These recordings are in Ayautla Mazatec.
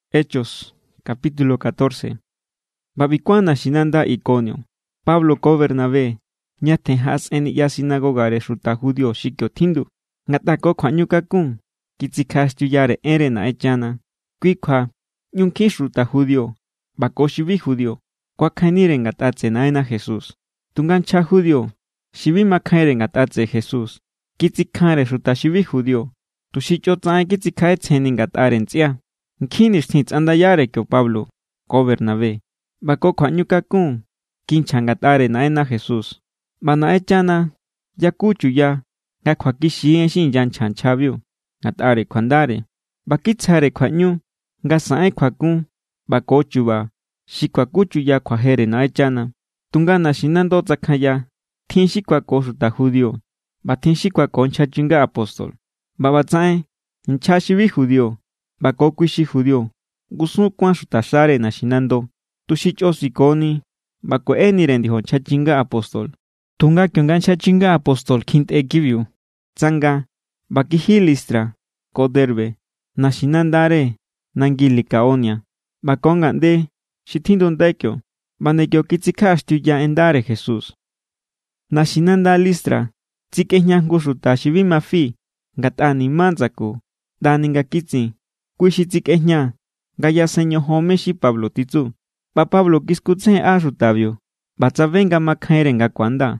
ꞌBa ꞌbi kuán naxinanda Ikonio, Pablo ko Bernabé ñatjen jaꞌasꞌen niꞌya sinagogare xuta judío xi kio tjindu. Ngatꞌa ko kjuaꞌñukakun kitsikjaꞌaxtiuyare enre Naꞌenchana, kui kjua ꞌñu nkjin xuta judío ꞌba ko xi bi judío kuakjainnire ngatꞌa tseꞌe Naꞌenna Jesús. Tunga nchja judío xi bi makjainre ngatꞌa tseꞌe Jesús kitsikjanre xuta xi bi judío tuxi chꞌotsaꞌen kitsikjaꞌetsjenni ngatꞌare ntsꞌia. Nkjin nixtjin tsꞌandayare kio Pablo ko Bernabé ꞌba ko kjuaꞌñukakun kinchja ngatꞌare Naꞌenna Jesús. ꞌBa Naꞌenchana yaku chuya nga kjuakixi= en xi inyanchja nchjabiu ngatꞌare kjuandare, ꞌba kitsjare kjuaꞌñu nga saꞌen kjuakun ꞌba ko chu̱ba̱ xi kuakuchuya kjuajere Naꞌenchana. Tunga naxinando tsakjanya. Tjin xi kuako xuta judío, ꞌba tjin xi kuako nchja chinga apóstol. ꞌBa ꞌbatsaꞌen nchja xi bi judío ꞌba ko kui xi judío ngusun kuán xutaxare naxinando, tuxi chꞌo sikoni ꞌba kueꞌenire ndiojo nchja chinga apóstol. Tunga kionga nchja chinga apóstol kjintꞌe kibiu, tsanga ꞌba kiji Listra ko Derbe, naxinandare nangi Licaonia, ꞌba ko ngaꞌnde xi tjindundai kio. ꞌBa nde kio kitsikjaꞌaxtiuya en ndare Jesús. Naxinanda Listra tsikꞌejña jngu xuta xi bi ma fi ngatꞌa ni̱má ndsaku ꞌndani nga kitsin. Kui xi tsikꞌejña nga yasen ñojon mé= xi Pablo titsu. ꞌBa Pablo kiskutsejenꞌa xutabiu ꞌba tsabe nga makjainre nga ku̱anda.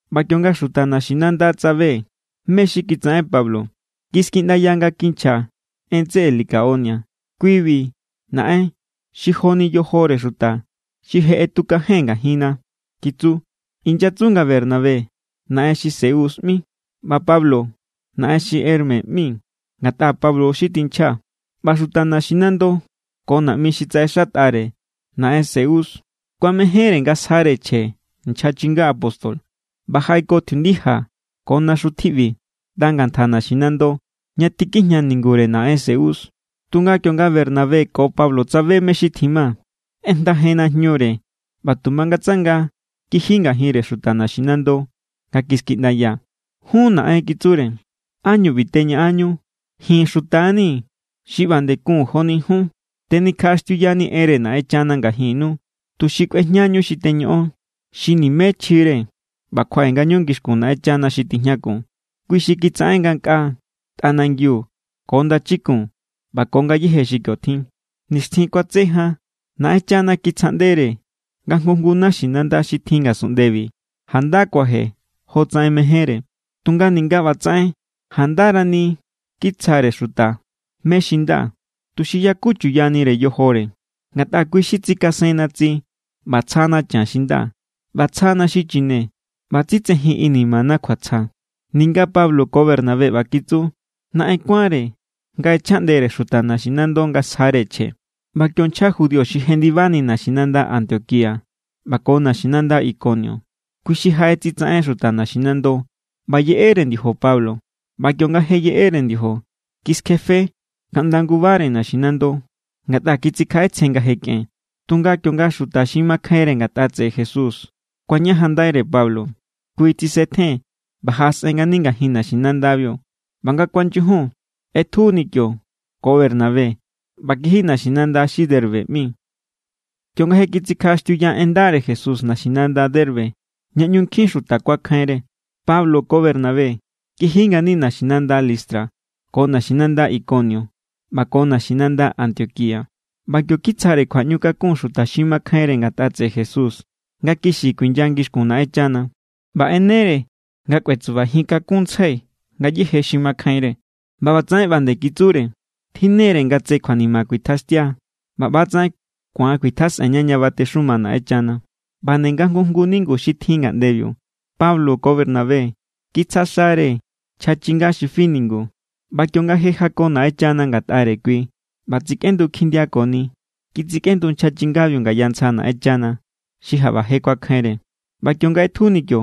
ꞌBa kionga xuta naxinanda tsabe mé= xi kitsaꞌen Pablo, kiskiꞌndaya nga kinchja en tseꞌe Licaonia: —Kui=bi naꞌen xi joni yojore xuta xi je ꞌetukajen ngajinna —kitsu. Inyatsu nga Bernabé= naꞌen xi Zeus ꞌmi ꞌba Pablo= naꞌen xi Hermes ꞌmi, ngatꞌa Pablo xi tinchja. ꞌBa xuta naxinando ko naꞌmi xi tsaꞌexatꞌare naꞌen Zeus kuamejénre nga sjare chje nchja chinga apóstol ꞌba jaꞌeko tjiundija ko naxu tjiꞌbi ꞌnda ngantja naxinando, ña tikijña ningure naꞌen Zeus. Tunga kionga Bernabé ko Pablo tsabe mé= xi tjima, ꞌejndajen najñure ꞌba tu mangatsanga kiji ngajinre xuta naxinando nga kiskiꞌndaya: —Jun naꞌen —kitsure—, ¿ánñu ꞌbi teñaꞌanñu? Ji̱n xuta= nii̱ xi ꞌba nde kun joni jun. Tenikjaꞌaxtiuyanii̱ enre Naꞌenchana ngajinnu tuxi kꞌuejñañu xi teñoꞌon, xi nimé chjire, ꞌba kjuaꞌe ngañu ngixkun Naꞌenchana xi tijñakun. Kui xi kitsaꞌen ngankꞌaa, tꞌanangiu ko ndachikun ꞌba ko ngayéje xi kio tjin. Nixtjin kuatse jan Naꞌenchana kitsjaꞌndere nga jngu jngu naxinanda xi tjin ngasunꞌndebi janda kuaje jo tsaꞌen mejénre. Tunga ninga ꞌba tsaꞌen, jandarani kitsjare xuta mé= xi nda, tuxi yaku chuyanire yojore. Ngatꞌa kui xi tsikasenna tsi, ꞌba tsjana chan xi nda, ꞌba tsjana xi chine, ꞌba tsitsejin inimana kjuatsja. Ninga Pablo ko Bernabé ꞌba kitsu, naꞌen kuánre nga ꞌechjaꞌndere xuta naximando nga sjare chje. ꞌBa kio nchja judío xi jendibani naxinanda Antioquía ꞌba ko naxinanda Ikonio, kui xi jaꞌetsitsaꞌen xuta naxinando. ꞌBa yeꞌere ndiojo Pablo, ꞌba kionga je yeꞌere ndiojo, kiskjefe kaꞌnda ngubare naxinando, ngatꞌa kitsikjaꞌetsjen nga je kꞌen. Tunga kionga xuta xi makjainre ngatꞌa tseꞌe Jesús kuañajanndaire Pablo, kui tsisetjen ꞌba jaꞌasꞌen ngani ngajin naxinandabiu. ꞌBa nga kuanyujun, ꞌetjuni kio ko Bernabé ꞌba kiji naxinanda xi Derbe ꞌmi. Kionga je kitsikjaꞌaxtiuya en ndare Jesús naxinanda Derbe ña ꞌñu nkjin xuta kuakjainre, Pablo ko Bernabé kiji ngani naxinanda Listra ko naxinanda Ikonio ꞌba ko naxinanda Antioquía. ꞌBa kio kitsjare kjuaꞌñukakun xuta xi makjainre ngatꞌa tseꞌe Jesús nga kixi kuinya ngixkun Naꞌenchana. ꞌBa ꞌenere nga kꞌuetsubajin kakunntsjai ngayéje xi makjainre. ꞌBa ꞌbatsaꞌen ꞌba nde kitsure: —Tjinnere nga tse kjuanima kuitjaxtia ꞌba ꞌbatsaꞌen ku̱an kuitjasꞌenña ña batexuma Naꞌenchana. ꞌBa nde nga jngu jngu ningu xi tjin ngaꞌndebiu, Pablo ko Bernabé kitsja xare nchja chinga xi fi ningu. ꞌBa kionga je jako Naꞌenchana ngatꞌare kui ꞌba tsikꞌendu kjindiakoni, kitsikꞌendu nchja chingabiu ngaya ntsja Naꞌenchana, xi jaꞌba je kuakjainre. ꞌBa kionga ꞌetjuni kio,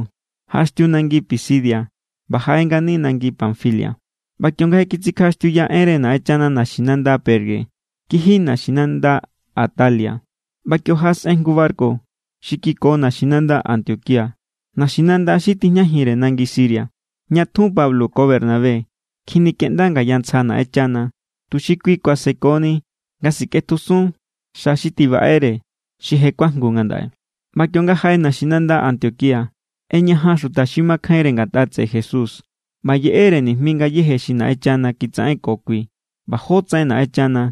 jaꞌaxtiu nangi Pisidia ꞌba jaꞌe ngani nangi Panfilia. ꞌBa kionga je kitsikjaꞌaxtiuya enre Naꞌenchana naxinanda Perge, kiji naxinanda Atalia. ꞌBa kio jaꞌasꞌen jngu barku xi kiko naxinanda Antioquía, naxinanda xi tijñajinre nangi Siria, ña tjun Pablo ko Bernabé kjinikeꞌnda ngaya ntsja Naꞌenchana, tuxi kui kuasekoni nga sikꞌetjusun xa xi tibaꞌere, xi je kuajngu ngandaꞌe. ꞌBa kionga jaꞌe naxinanda Antioquía, ꞌeñajan xuta xi makjainre ngatꞌa tseꞌe Jesús ꞌba yeꞌere nijmi ngayéje xi Naꞌenchana kitsaꞌenko kui ꞌba jótsaꞌen Naꞌenchana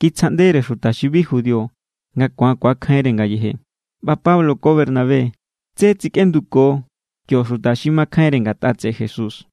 kitsjaꞌndere xuta xi bi judío nga ku̱an ku̱akjainre ngayeje. ꞌBa Pablo ko Bernabé tsé tsikꞌenduko kio xuta xi makjainre ngatꞌa tseꞌe Jesús.